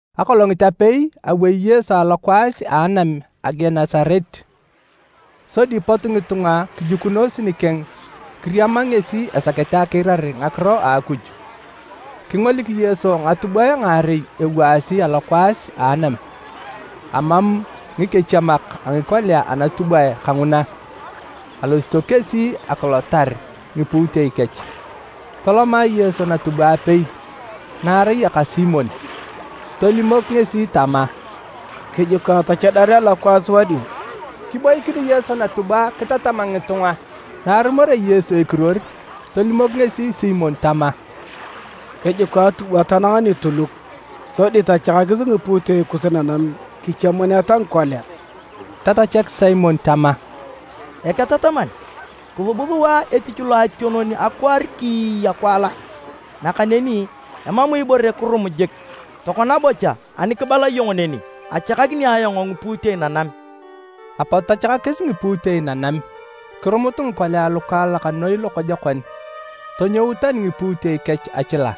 Akolongit apei, awei Yesu alokwaas a Anam a Genesaret, sodi pot ngitunga kijukunos nikeng kiriama ngesi esakete akiirar ngakiro a Akuj. Kingolik Yesu ngatubwae ngaarei ewaasi alokwaas a anam, amam ngikechiemak a ngikolia anatubwae kanguna, alosito kesi akilotar ngipuutei kech. Toloma Yesu natubwa apei, na arai aka Simon, tolimok ngesi tama, “Kijuka tachadar a lokwaas wadio. Kiboikin Yesu natubwa kitatam ngitunga.” Na arumorea Yesu ekiruor, tolimok ngesi Simon tama, “Kijuka atubwa tanang nituluk, sodi tachakakis ngipuutei kus nanam kichiemuneta ngikolia.” Tatachak Simon tama, “Eketataman, kisub sua etich loationon akwaar kiiya kiwala, nakaneni emam ibore kirum jik. Tokona bocha ani kibala iyong neni, achakakini ayong ngipuutei nanam.” Apot tachakakis ngipuutei nanam, kirumut ngikolia lukaalak noi lokojokon, tonyout tani ngipuutei kech achila.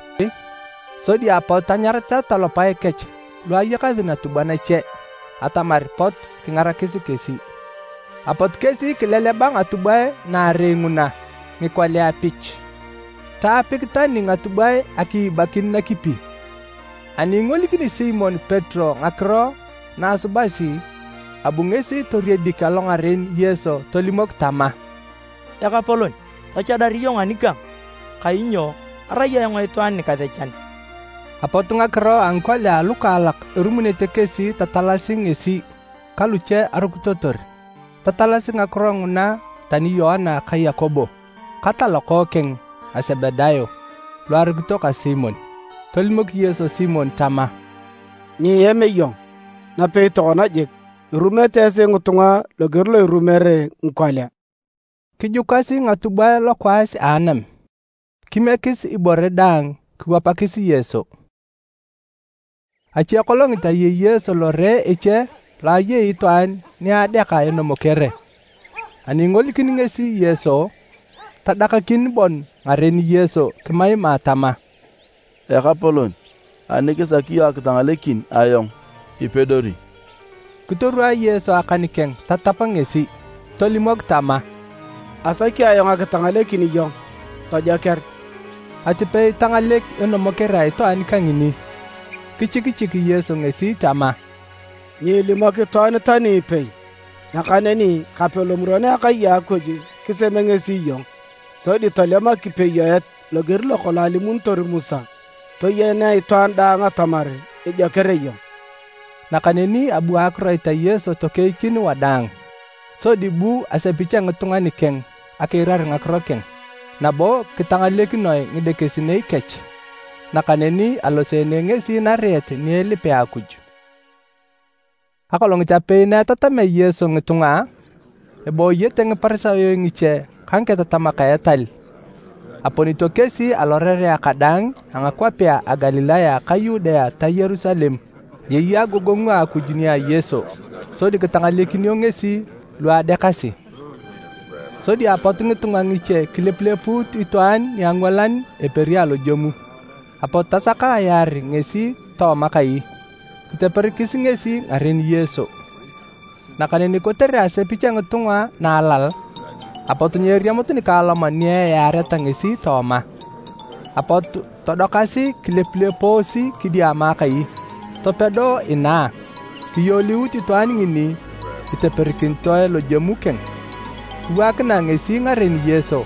Sodi apot tanyarata talopae kech lu ayakasi natubwa nache atamar pot kingarakis kesi. Apot kesi kileleba ngatubwae naarei nguna ngikolia pich, taapik tani ngatubwae akiibakin nakipi. Ani ingolikini Simon Petero ngakiro na asubasi abu ngesi toriedik alongaren Yesu tolimok tama, “Ekapolon, tachadar iyong anikang, kainyo arai ayong itwaan nikasechan!” Apot ngakiro a ngikolia alukaalak erumunete kesi tatalasi ngesi ka luche arukitotor. Tatalasi ngakiro nguna tani Yoana ka Yakobo, ka talokookeng a Sebedayo lu arukito ka Simon. Tolimok Yesu Simon tama, “Nyiem iyong, napei tokona jik, irumete esi ngitunga loger lo irumere ngikolia.” Kijukasi ngatubwae lokwaas a anam, kimiekis ibore daang kiwapakis Yesu. Achekolongit ayei Yesu lore eche lo ayei itwaan ni adeaka enomokere. Ani ingolikini ngesi Yesu, tadakakin bon ngaren Yesu kimaima tama, “Ekapolon, ani kisaki iyong akitangalekin ayong ipedori!” Kitorwaa Yesu akan keng tatap ngesi. Tolimok tama, “Asaki ayong akitangalekin iyong, tojoker!” Atipei tangalek enomokere a itwaan kangini. Kichikichik Yesu ngesi tama, “Nyiilimok itwaan tani ipei, nakaneni kape lomuron a akai a Akuj kiseme ngesi iyong, sodi tolem akipeyoet loger lokolong alimunitor Musa, toyenea itwaan daang atamar ijoker iyong.” Nakaneni abu akiroit a Yesu tokeikin wadaang, sodi bu asepich a ngitunga nikeng akiirar ngakiro keng, nabo kitangalekinoe ngidekesinei kech. Nakaneni aloseene ngesi nariet ni elipea Akuj. Akolongit apei na etatamea Yesu ngitunga, ebooyete Ngiparisayo ngiche ka ngiketatamak a etal. Aponito kesi alorerea kadaang a ngakwapea a Galilaya ka Yudea ta Yerusalem. Ayei agogongu a Akuj nia Yesu sodi kitangalekinio ngesi lu adeakasi. Sodi apot ngitunga ngiche kilepulepuut itwaan niangwalan eperi alojemu, apot tasaka ayaar ngesi tooma kai, kiteperikis ngesi ngaren Yesu. Nakaneni kotere asepich a ngitunga na alal, apot nyeeriamut nikaaloman ni eyaareta ngesi tooma. Apot todokasi kilepulepoosi kidiama akai, topedo inaa, kiyoliut itwaan ngini iteperikinitoe lojemu keng, kiwaakinae ngesi ngaren Yesu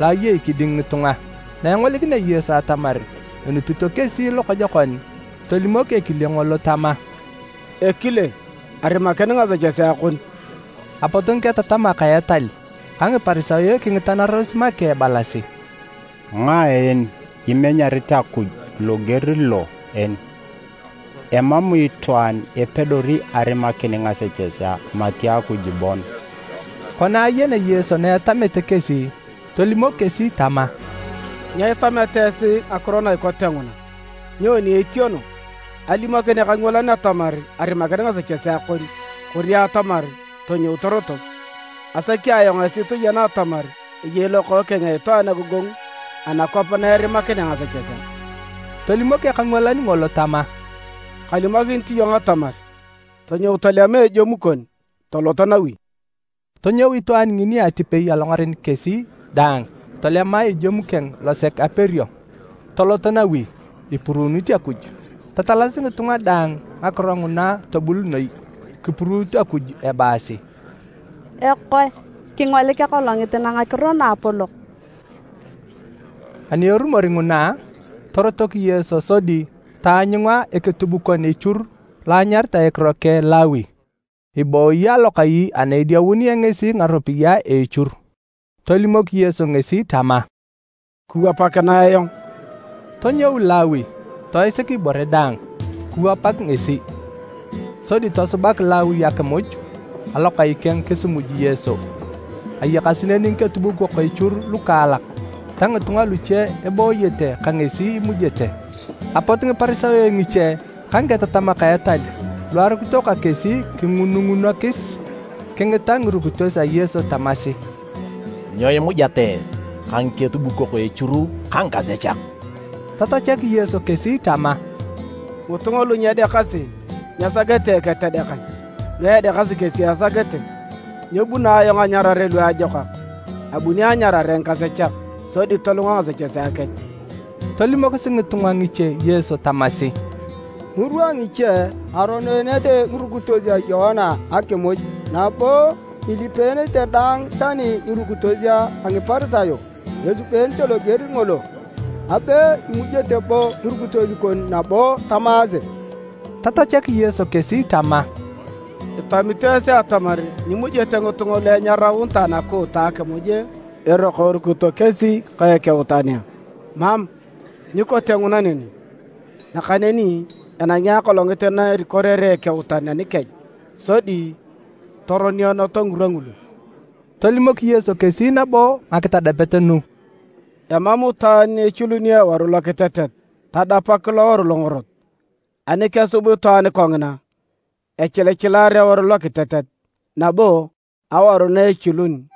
lo ayei kiding ngitunga. Na engolikinea Yesu atamar enupito kesi lokojokon, tolimok ekile ngolo tama, “Ekile, arimakin ngasechesea kon.” Apot ngiketatamak a etal ka Ngiparisayo kingitanaros make ebalasi, “Ngae en imenyi Akuj loger lo en? Emam itwaan epedori arimakin ngasechesea mati Akuj bon!” Kona ayenea Yesu na etamete kesi, tolimok kesi tama, “Nyo itameta esi ngakiro na ikote nguna? Nyoni etieno, alimokin ekangwalan atamar, ‘Arimakin ngasechesea kon’ kori atamar, ‘Tonyou torotok?’ Asaki ayong esi toyena atamar eyei Lokookeng a Itwaan agogongu anakwap na erimakinea ngasechesea.” Tolimok ekangwalan ngolo tama, “Kalimokinit iyong atamar, ‘Tonyou tolema ejemu kon, tolot nawi!’” Tonyou itwaan ngini atipei alongaren kesi daang tolema ejemu keng losek aperio, tolot nawi, ipuruunit Akuj. Tatalasi ngitunga daang ngakiro nguna tobul noi! Kipuruut Akuj ebaasi, “Ekoe! Kingolik akolongit na ngakiro naapolok!” Ani erumor nguna, torotok Yesu sodi taanyunga eketubukon echur lo anyaritae ekiro keng Lawi, ibooyi alokai ana ediaununea ngesi ngaropiyae a echur. Tolimok Yesu ngesi tama, “Kiwapakinae ayong.” Tonyou Lawi, toisik ibore daang, kiwapak ngesi. Sodi tosubak Lawi akimuj alokai keng kisimuj Yesu, ayakasi neni ngiketubukok echur lukaalak ta ngitunga luche ebooyete ka ngesi imujete. Apot Ngiparisayo ngiche ka Ngiketatamak a etal lu arukito ka kesi kingunungunokis kingita ngirukitos a Yesu tamasi, “Nyo imujeta esi ka ngiketubukok echur ka ngikasechak?” Tatachak Yesu kesi tama, “Ngitunga lu nyedeakasi nyesakete eketedekan, lu edeakasi kesi esakete. Nyebuno ayong anyarare luajokak, abuni anyarare ngikasechak, sodi tolunga ngasechesea kech.” Tolimokis ngitunga ngiche Yesu tamasi, “Ngirwa ngiche, aroneenete ngirukitos a Yoana akimuj nabo ilipeenete dang, tani ngirukitos a Ngiparisayo esubete loger ngolo, abe imujete bo ngirukitos kon nabo tamaase!” Tatachak Yesu kesi tama, “Itamito esi atamar nyimujete ngitunga lu enyaraunitae nakuuta akimuj eroko erukito kesi ka ekeutan a? Mam, nyikote nguna neni! Nakaneni enangi akolongit na erikorere ekeutan anikech sodi toroneeneto ngirwa ngulu.” Tolimok Yesu kesi nabo ngakitadapet nu: “Emam itwaan echiluni eworu lokitetet tadapak loworu longorot. Ani kesub itwaan kongina, echilichilar eworu lokitetet, nabo awaru na achilun,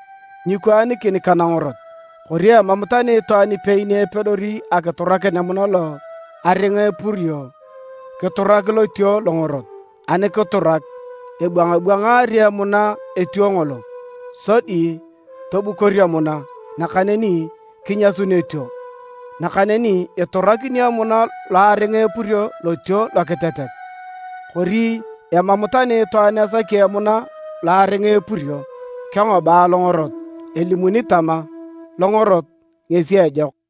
nyikwaanikin ka nangorot. Kori emam tani itwaan ipei ni epedori akiturakin emuna lo aringa epurio, kiturak lotuo longorot. Ani kiturak, ebwangabwangari emuna etuo ngolo, sodi tobukor emuna, nakaneni kinyasun etuo. Nakaneni iturakinio emuna lo aringa epurio lotuo lokitetet! Kori emam tani itwaan esaki emuna lo aringa epurio, kengoba longorot. Elimuni tama, ‘Longorot ngesi ejok.’”